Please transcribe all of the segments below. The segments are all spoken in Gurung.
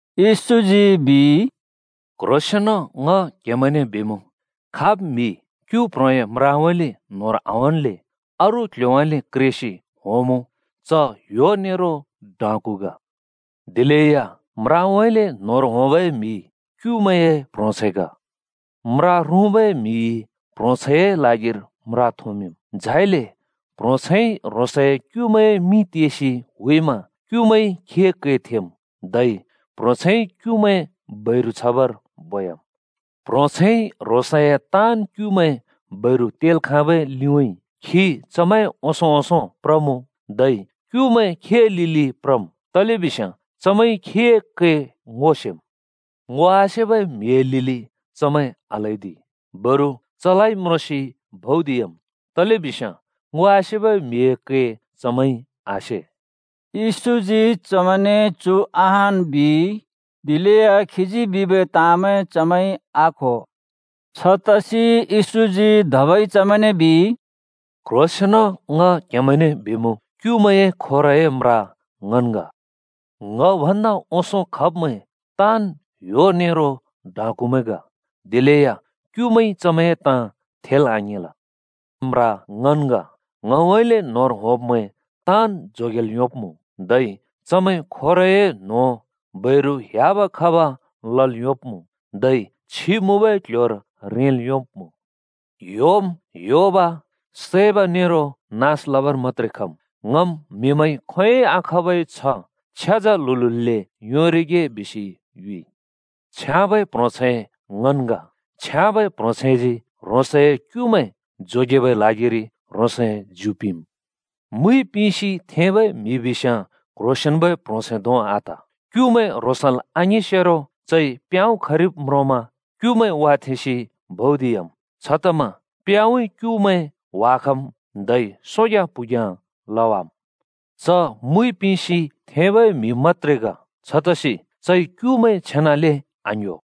येशूजी बिइ “क्ह्रोंसेंन ङ क्हेमैंने बिमुँ, खाब् म्हि क्‍यु प्ह्रोंए म्राउँइँले न्होंर आहोंल्‍ले अरू क्ल्ह्‍योउँइँले क्रेसि होंमुँ च ह्‍यो नेरो डाँकु ग। दिलेया म्राउँइँले न्होंर होंबै म्हि क्युमैंए प्ह्रोंछैं ग। म्रा रुँबै म्हिइ प्ह्रोंछैंए ल्हागिर म्रा थोंमिंम्। झाइले प्ह्रोंछैंइ ह्रोंसए क्युमैंए मिं तेसि हुइमा क्युमैंइ खीए कै थेम्। धै प्ह्रोंछैंइ क्युमैं बैरु छबर बोयाम्। प्ह्रोंछैंइ ह्रोंसए ताँन् क्‍युमैं बैरु तेल् खाँबै लिउँइँ खी चमैंए ओंसों-ओंसों प्रमुँ, धै क्युमैं खीए लिलि प्रम्। तलेबिस्याँ चमैंइ खीए कै ङो सेम्। ङो आसेबै म्हिए लिलि चमैं आल्हैदि, बरु चलाइ म्रोंसि भौदियाम्। तलेबिस्याँ ङो आसेबै म्हिए कै चमैंइ आसे।” येशूजी चमैंने चु अहान् बिइ, दिलेया खीजी बिबै ताँमैं चमैंइ आक्हो। छतसि येशूजी धबै चमैंने बिइ, “क्ह्रोंसेंन ङ क्‍हेमैंने बिमुँ, क्युमैंए खोरए म्रा ङन् ग। ङ भन्दा ओंसों खब्मैं ताँन् ह्‍यो नेरो डाँकुमैं ग। दिलेया क्युमैंइ चमैंए ताँ थेल् आङेंल। म्रा ङन् ग। ङउँइँले न्‍होंर होंब्मैं ताँन् जोगेल् योंब्‍मुँ। धै चमैं खोरए न्हों, बैरु ह्‍याब खब लल् योंब्मुँ, धै छि मुँबै क्ल्ह्‍योर रेंल् योंब्‍मुँ। ह्‍योम् ह्‍योब, सैब नेरो नास लबर मत्‍त्रे खम्। ङम् म्हिमैंइ खोंयोंइ आखाँबै छ्ह छ्याजा ल्हुल्हुले योंरिगे बिसि युइ। “छ्याँबै प्ह्रोंछैं ङन् ग। छ्याँबै प्ह्रोंछैंजी ह्रोंसए क्युमैं जोगेबै ल्हागिरि ह्रोंसए ज्यु पिंम्। मुइ पिंसि थेंबै म्हि बिस्याँ क्ह्रोंसेंन्बै प्ह्रोंछैं धों आत। क्युमैं ह्रोंसल् आङिंसेरो चइ प्याँउँ खरिब् म्रोंस्याँ क्युमैं वाथेंसि भौदियाम्। छतमा प्याँउँइँ क्युमैं ह्‍वाखम्, धै सोग्याँ प्हुग्याँ लवाम्। च मुइ पिंसि थेंबै म्हि मत्‍त्रे ग, छतसि चइ क्युमैं छेनाले आङ्‌ह्‍यो।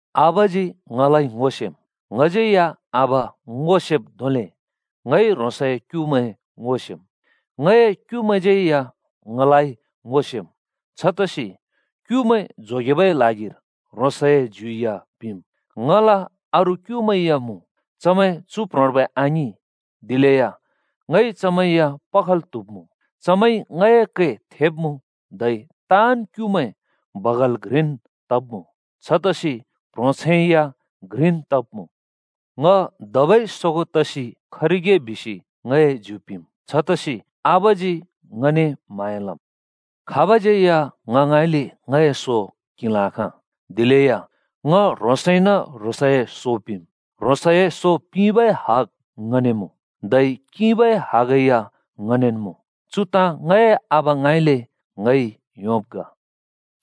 “आबाजी ङलाइ ङो सेम्, ङज्यै या आबा ङो सेब् धोंले ङइ ह्रोंसए क्युमैं ङो सेम्। ङए क्युमैंज्यै या ङलाइ ङो सेम्। छतसि क्युमैं जोगेबै ल्हागिर ह्रोंसए ज्यु या पिम्। ङला अरू क्युमैं या मुँ, चमैं चु प्ह्रोंर्बै आङिं। दिलेया ङइ चमैं या पखल् त्हुब्मुँ। चमैंइ ङए कै थेब्मुँ, धै ताँन् क्युमैं बगाल घ्रिन् तब्मुँ, छतसि प्ह्रोंछैं या घ्रिन् तब्मुँ। “ङ धबै सोगों तसि खरिगे बिसि ङए ज्यु पिंम्। छतसि आबाजी ङने म्‍हाँया लम्। खाबज्यै या ङ ङाँइँले ङए सो किंल् आखाँ, दिलेय ङ ह्रोंसइन ह्रोंसए सो पिंम्। ह्रोंसए सो पिंबै हग ङने मुँ, धै किंबै हगैया ङनेन् मुँ। चु ताँ ङए आबा ङाँइँले ङइ योंब् ग।”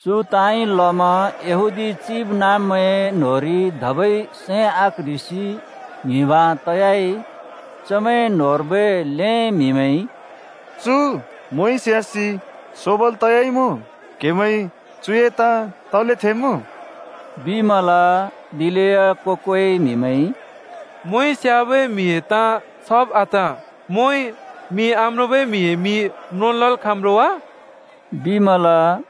चु ताँइ लमा यहूदी चिबनाँब्मैंए न्‍होंरि धबै सैं आक्ह्रिसि ङ्हिबाँ तयाइ। चमैं न्होंर्बै ल्‍हें म्हिमैंइ “चु मोंइ स्यासि सोबल् तयाइमुँ। क्‍हेमैंइ चुए ताँ तले थेमुँ?” बिमल। दिलेया को-कोइ म्हिमैंइ “मोंइ स्‍याबै म्हिए ताँ छाब आत! मोंइ मि आम्रोंबै म्हिए मि म्रोंल् लल् खाँम् रो वा?” बिमल।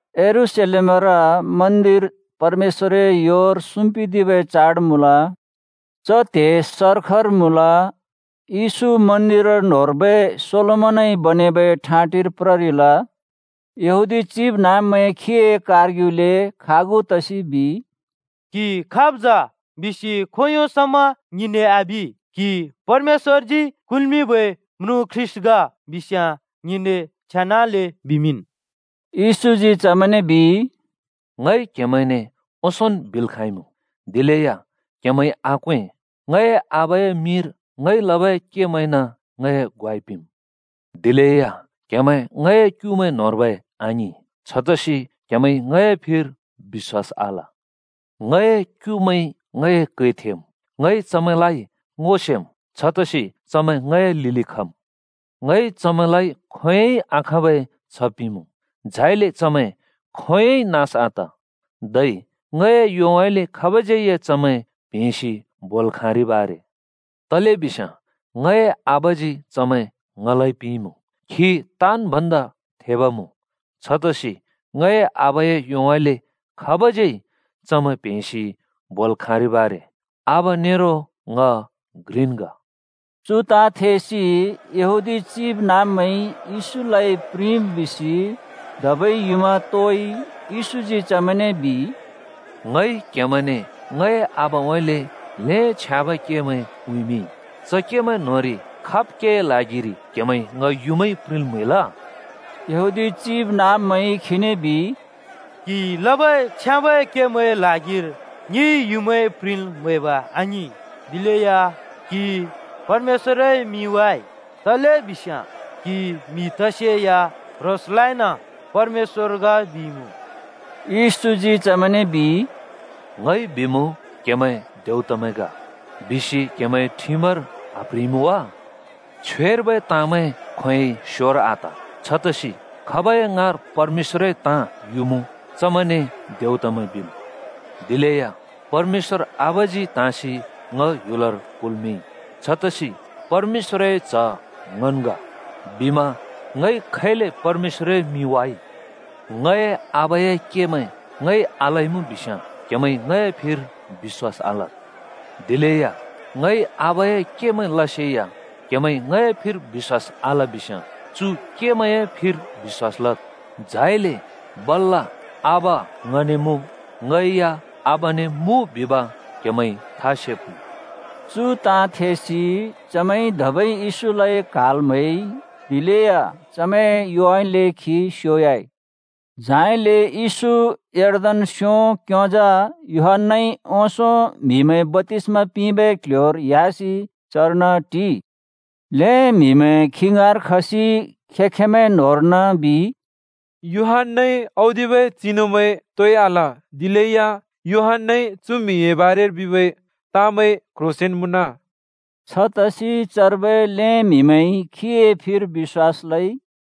यरूशलेमर मन्दिर परमेश्‍वरए योर सुम्पिदिबै चाड मुँल। च त्हे सर्खर मुँल। येशू मन्दिर न्होंर्बै सोलोमनइ बनेबै ठाँटिर प्ररिल। यहूदी चिबनाँब्मैं खीए कारग्युले खागु तसि बिइ, “क्‍हि खाब् जा बिसि खोंयों समा ङिने आबि? क्हि परमेश्‍वरजी कुल्मिंबै म्रुँ ख्रीष्‍ट ग बिस्याँ ङिने छेनाले बिमिंन्।” येशूजी चमैंने बिइ, “ङइ क्हेमैंने ओंसोंन् बिल् खाँइमुँ, दिलेया क्‍हेमैंइ आक्वें। ङए आबाए मिंर ङइ लबै केमैंइन ङए ग्वाइ पिंम्। दिलेया क्‍हेमैं ङए क्युमैं न्होंर्बै आङिं, छतसि क्‍हेमैंइ ङए फिर बिश्‍वास आल। ङए क्युमैंइ ङए कै थेम्, ङइ चमैंलाइ ङो सेम्। छतसि चमैं ङए लिलि खम्। ङइ चमैंलाइ खोंयोंइ आखाँबै छ्ह पिंमुँ, झाइले चमैं खोंयोंइ या नास आत। धै ङए योउँइँले खाबज्यै चमैं प्हेंसि बोल् खाँरिब् आरे। तलेबिस्याँ ङए आबाजी चमैं ङलाइ पिंइँमुँ, खी ताँन् भन्दा थेब मुँ। छतसि ङए आबाए योउँइँले खाब‍ज्‍यै चमैं प्हेंसि बोल् खाँरिब् आरे। आबा नेरो ङ घ्रिन् ग।” चु ताँ थेसि यहूदी चिबनाँब्मैंइ येशूलाइ प्रिंब् बिसि धबै युँमा तोइ। येशूजी चमैंने बिइ, “ङइ क्हेमैंने ङए आबाउँइँले ल्‍हें छ्याँबै केमैं उँइँमिंइ। च केमैं न्‍होंरि खाब् केए ल्हागिरि क्हेमैंइ ङ युँमाइ प्रिंल् म्‍हैल?” यहूदी चिबनाँब्मैंइ खीने बिइ, “क्हिइ लबै छ्याँबै केमैंए ल्हागिर ङिइ युँमाइ प्रिंल् म्हैब आङिं, दिलेया क्‍हिइ परमेश्‍वरए मिं वाइ। तलेबिस्याँ क्हि म्हि तसेया ह्रोंसलाइन परमेश्‍वर ग बिइमुँ।” येशूजी चमैंने बिइ, “‘ङइ बिमुँ, क्हेमैं देउतमैं ग,’ बिसि क्हेमैंए ठिमर आप्ह्रिइमुँ वा? छ्वेर्बै ताँमैं खोंयोंइ स्योर आत। छतसि खाबै ङाँर परमेश्‍वरए ताँ युमुँ, चमैंने देउतमैं बिम्। दिलेया परमेश्‍वर आबाजी त्हाँसि ङ ह्‍युलर कुल्मिंइ। छतसि ‘परमेश्‍वरए च्ह ङन् ग’ बिमा ङइ खैले परमेश्‍वरए मिं वाइ? ङए आबाए केमैं ङइ आलइमुँ बिस्याँ क्‍हेमैंइ ङए फिर बिश्‍वास आलद्। दिलेया ङइ आबाए केंमैं लसेया क्हेमैंइ ङए फिर बिश्‍वास आल बिस्याँ चु केमैं फिर बिश्‍वास लद्। झाइले बल्‍ल ‘आबा ङने मुँ, ङै या आबाने मुँ,’ बिब क्‍हेमैंइ था सेब्मुँ।” चु ताँ थेसि चमैंइ धबै येशूलाइ क्‍हाल् म्‍हैइ। दिलेया चमैंए योउँइँले खी स्योयाइ। झाइले येशू यर्दन स्यों क्‍योंजा यूहन्‍नाइ ओंसों म्हिमैं बप्‍तिस्‍मा पिंबै क्‍ल्‍ह्‍योर ह्‍यासि चर्न टिइ। ल्‍हें म्हिमैं खी ङाँर खसि खें-खेंमैं न्होंर्न बिइ, “यूहन्‍नाइ औदिबै चिनुमैं तोइ आल, दिलेया यूहन्‍नाइ चु म्हिए बारेर बिबै ताँमैं क्ह्रोंसेंन मुँन।” छतसि चर्बै ल्‍हें म्हिमैंइ खीए फिर बिश्‍वास लइ।